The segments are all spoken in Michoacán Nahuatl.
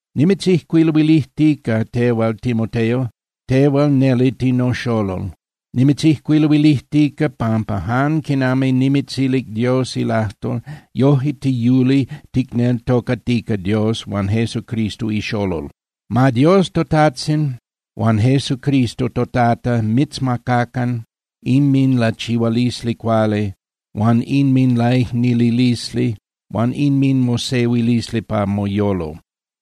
Nimitzijcuiluilijtica tehual, Timoteo, tehual neli tinoxolol. Nimitzijcuiluilijtica pampa jan quinami nimitzilic Dios ilajtol, yoje tiyuli ticneltocatica Dios huan Jesucristo ixolol. Ma Dios toTajtzin huan Jesucristo toTata mitzmacacan inminlachihualisli cuali huan inminlaicnililisli huan inminmosehuilisli pa moyolo.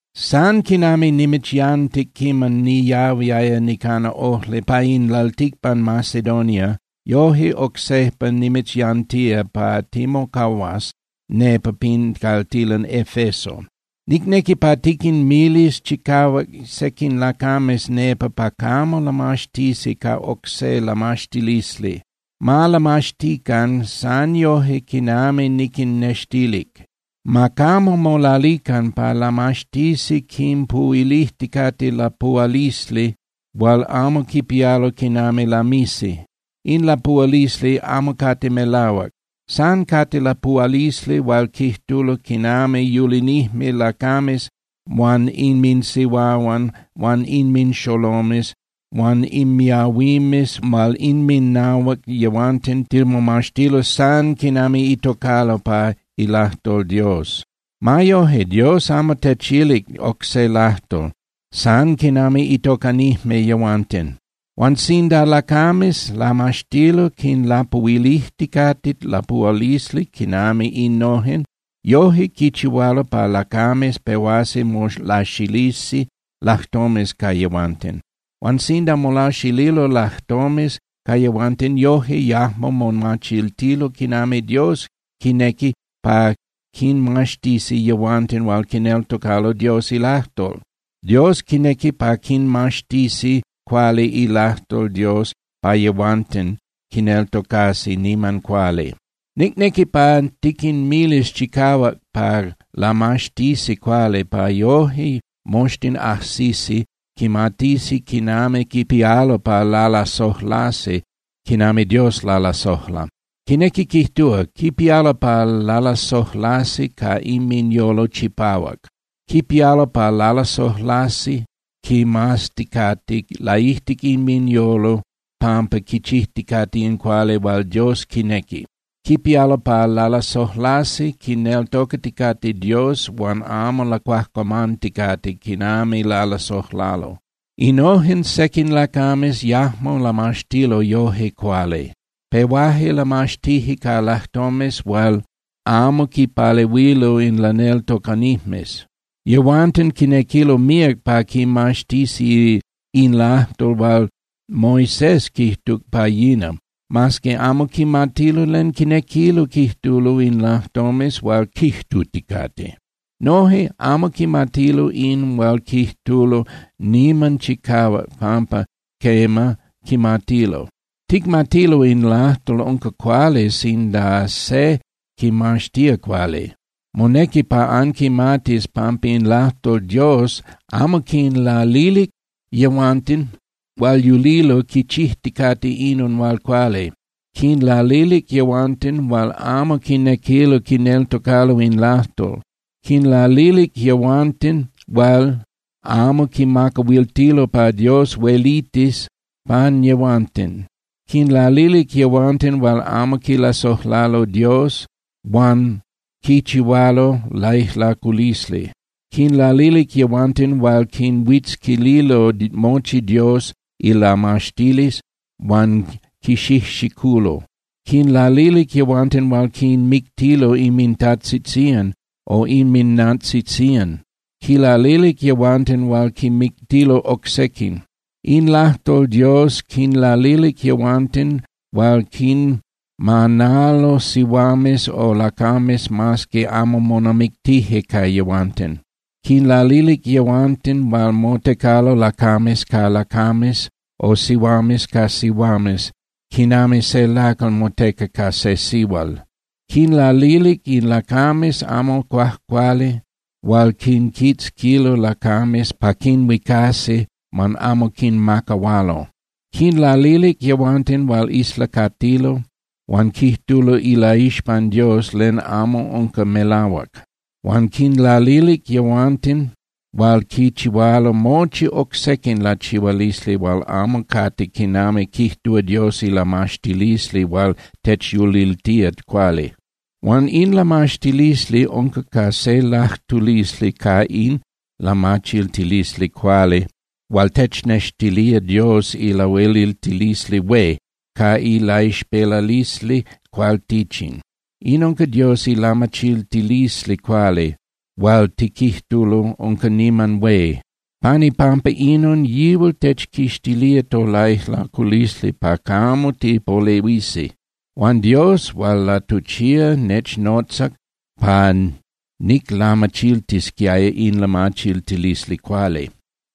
San quinami nimitzyantic quiman niyahuiaya nicana ojli pa in lalticpan Macedonia, yoje oc sejpa nimitzyantía pa timocahuas nepa pin caltilan Efeso. Nicnequi pa tiquinmilis chicahuac sequin lacames nepa pa camo lamaxtisi ca oc se lamaxtilisli. Ma lamaxtican san yoje quinami niquinnextilic. Ma camo molalican pa lamaxtisi quinpuhuilijticate lapuhualisli hual amo quipialo quinami lamisi. In lapuhualisli amo cate melahuac, san cate lapuhualisli hual quijtulo quinami yulinijme lacames huan inminsihuahuan huan inminxolomes huan inmiahuimes hual inminahuac yehuanten timomaxtilo san quinami itocalo pa ilajtol Dios. Ma yoje, Dios amo techilic oc se lajtol, san quinami itocanijme yehuanten. Huan sinda lacames lamaxtilo quinlapuhuilijticate lapuhualisli quinami innojen, yoje quichihualo pa lacames pehuasi molaxilisi lajtomes ca yehuanten. Huan sinda molaxililo lajtomes ca yehuanten, yoje yajmo momachiltilo quinami Dios quinequi pa quinmaxtisi yehuanten hual quineltocalo Dios ilajtol. Dios quinequi pa quinmaxtisi cuali ilajtol Dios pa yehuanten quineltocasi niman cuali. Nicnequi pa tiquinmilis chicahuac pa lamaxtisi cuali pa yoje moxtin ajsisi quimatisi quinami quipialo pa lalasojlasi quinami Dios lalasojla. Quinequi quijtúa, quipialo pa lalasojlasi ca inminyolo chipahuac. Quipialo pa lalasojlasi quimazticate laijtic inminyolo pampa quichijticate in cuali hual Dios quinequi. Quipialo pa lalasojlasi quineltocaticate Dios huan amo lacuajcuamanticate quinami lalasojlalo. Innojen sequin lacames yajmo lamaxtilo yoje cuali. Pehuaje lamaxtije ca lajtomes hual amo quipalehuilo in laneltocanijmes. Yehuanten quinequilo míac pa quimaxtisi in lajtol hual Moisés quijtuc pa yina, mas que amo quimatilo len quinequilo quijtulo in lajtomes hual quijtuticate. Noje amo quimatilo in hual quijtulo niman chicahuac pampa quema, quimatilo. Ticmatilo in lajtol unca cuali sinda se quimaxtía cuali. Monequi pa anquimatis pampa in lajtol Dios amo quinlalilic yehuanten hual yulilo quichijticate inon hual cuali. Quinlalilic yehuanten hual amo quinequilo quineltocalo in lajtol. Quinlalilic yehuanten hual amo quimacahuiltilo pa Dios huelitis pan yehuanten. Quinlalilic yehuanten hual amo quilasojlalo Dios huan quichihualo laijlaculisli. Quinlalilic yehuanten hual quinhuitzquililo mochi Dios ilamaxtilisli huan quixijxiculo. Quinlalilic yehuanten hual quinmictilo inmintajtzitzían o inminnantzitzían. Quinlalilic yehuanten hual quinmictilo oc sequin. In lajtol Dios quinlalilic yehuanten hual quinmanalo sihuames o lacames mas que amo monamictije ca yehuanten, quinlalilic yehuanten hual motecalo lacames ca lacames o sihuames ca sihuames quinami se lacal moteca ca se sihual. Quinlalilic in lacames amo cuajcuali hual quinquitzquilo lacames pa quinhuicasi huan amo quinmacahualo. Quinlalilic yehuanten hual islacatilo huan quijtulo ilaixpan Dios len amo unca melahuac. Huan quinlalilic yehuanten hual quichihualo mochi oc sequin lachihualisli hual amo cate quinami quijtúa Dios ilamaxtilisli hual techyuliltía cuali. Huan in lamaxtilisli unca ca se lajtulisli ca in lamachiltilisli cuali hual technextilía Dios ilahueliltilisli hué ca ilaixpelalisli cualtichin. In unca Dios ilamachiltilisli cuali hual tiquijtulo unca niman hué. Pan ipampa inon yihual techquixtilía tolaijlaculisli pa camo tipolehuisi. Huan Dios hual latuchía nechnotzac pa niclamachiltisquiaya in lamachiltilisli cuali.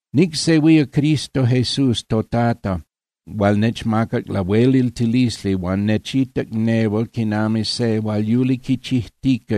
Nicsehuía Cristo Jesús toTata hual nechmacac lahueliltilisli huan nechitac nehual quinami se hual yuli quichijtica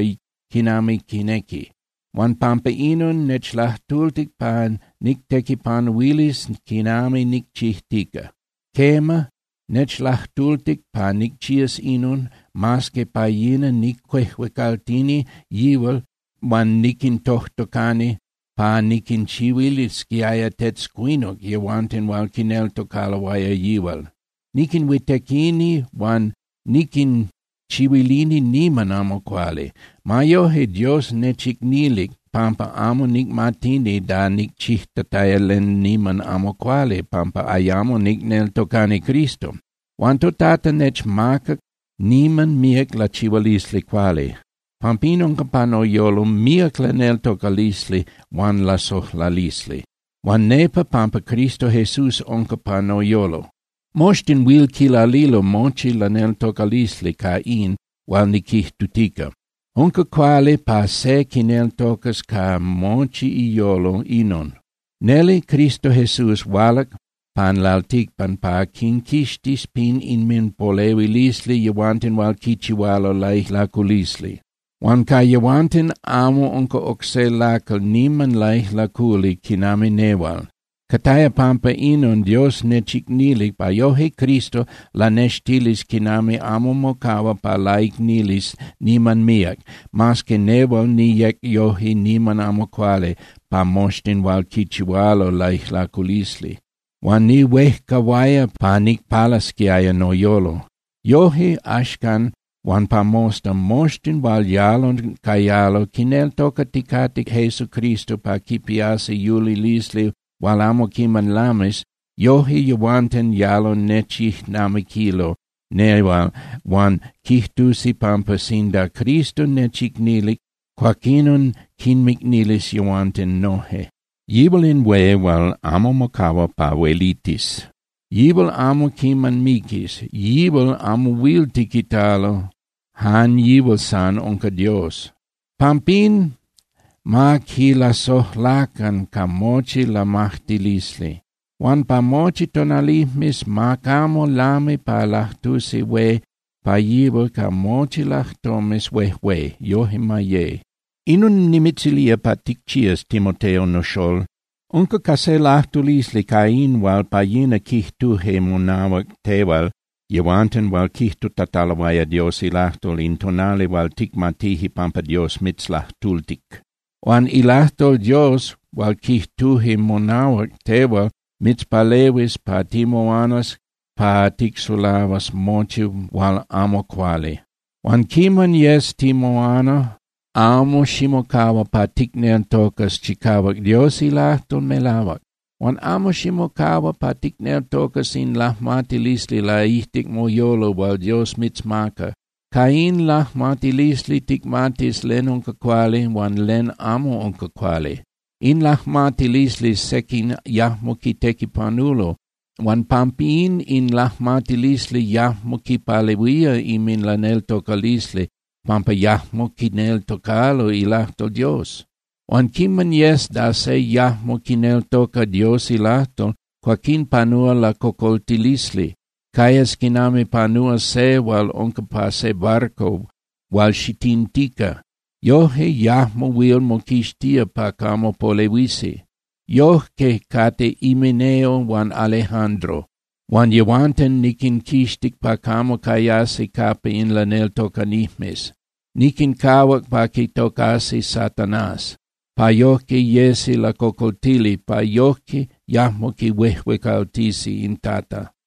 quinami quinequi. Huan pampa inon nechlajtultic pa nictequipanuilis quinami nicchijtica. Quema, nechlajtultic pa nicchías inon, mas que pa yina nicuejuecaltini yihual huan niquintojtocani pa niquinchihuilisquiaya tetzcuinuc yehuanten hual quineltocaloaya yihual. Niquinhuitequini huan niquinchihuilini niman amo cuali. Ma yoje, Dios nechicnilic pampa amo nicmatini da nicchijtataya len niman amo cuali pampa ayamo nicneltocani Cristo. Huan toTata nechmacac niman míac lachihualisli cuali. Pampín unca pa noyolo míac laneltocalisli huan lasojlalisli. Unca nepa pampa Cristo Jesús unca pa noyolo. Moxtin huil quilalilo mochi laneltocalisli ca in hual niquijtutica. Unca cuali pa se quineltocas ca mochi iyolo inon: Neli Cristo Jesús hualac pan lalticpan pa quinquixtis pin inminpolehuilisli yehuanten hual quichihualo laijlaculisli. Huan ca yehuanten amo unca oc se lacal niman laijlaculi quinami nehual. Cataya pampa inon Dios nechicnilic pa yoje Cristo lanextilis quinami amo mocahua pa laicnilis niman míac, mas que nehual niyec yoje niman amo cuali pa moxtin hual quichihualo laijlaculisli, huan nihuejcahuaya pa nicpalasquiaya noyolo. Yoje, axcan huan pa mosta, moxtin hual yalo cayalo quineltocaticate Jesucristo pa quipiasi yulilisli hual amo quiman lamis, yoje yehuanten yalo nechijnamiquilo nehual huan quijtusi pampa sinda Cristo nechicnilic, cuaquinon quinmicnilis yehuanten noje. Yihual in hué hual amo mocahua pa huelitis. Yihual amo quiman miquis, yihual amo huil tiquitalo, jan yihual san unca Dios. Pampín ma quilasojlacan ca mochi lamajtilisli. Huan pa mochi tonalijmes ma camo lami pa lajtusi hué pa yihual ca mochi lajtomes huejué. Yoje ma ye. Inon nimitzilía pa ticchías, Timoteo noxól. Unca ca se lajtulisli ca in hual pa yina quijtuje monahuac tehual yehuanten hual quijtutataloaya Dios ilajtol in tonali hual ticmatije pampa Dios mitzlajtultic. Huan ilajtol Dios hual quijtuje monahuac tehual mitzpalehuis pa timoanas pa ticsulahuas mochi hual amo cuali. Huan quiman yes timoana, amo ximocahua pa ticneltocas chicahuac Dios ilajtol melahuac. Huan amo ximocahua pa ticneltocas in lajmatilisli laijtic moyolo hual Dios mitzmaca. Ca in lajmatilisli ticmatis len unca cuali huan len amo unca cuali. In lajmatilisli sequin yajmo quitequipanulo huan pampín in lajmatilisli yajmo quipalehuía inminlaneltocalisli pampa yajmo quineltocalo ilajtol Dios. Huan quiman yes da se yajmo quineltoca Dios ilajtol, cuaquín panúa lacocoltilisli. Cayas quinami panúa se hual unca pa se barco hual xitintica. Yoje yajmo huil moquixtía pa camo polehuisi. Yojque cate Himeneo huan Alejandro, huan yehuanten niquinquixtic pa camo cayasi capa in laneltocanijmes. Niquincahuac pa quitocasi Satanás, pa yojque yesi lacocoltili, pa yojque yajmo quihuejuecaltisi in Tata.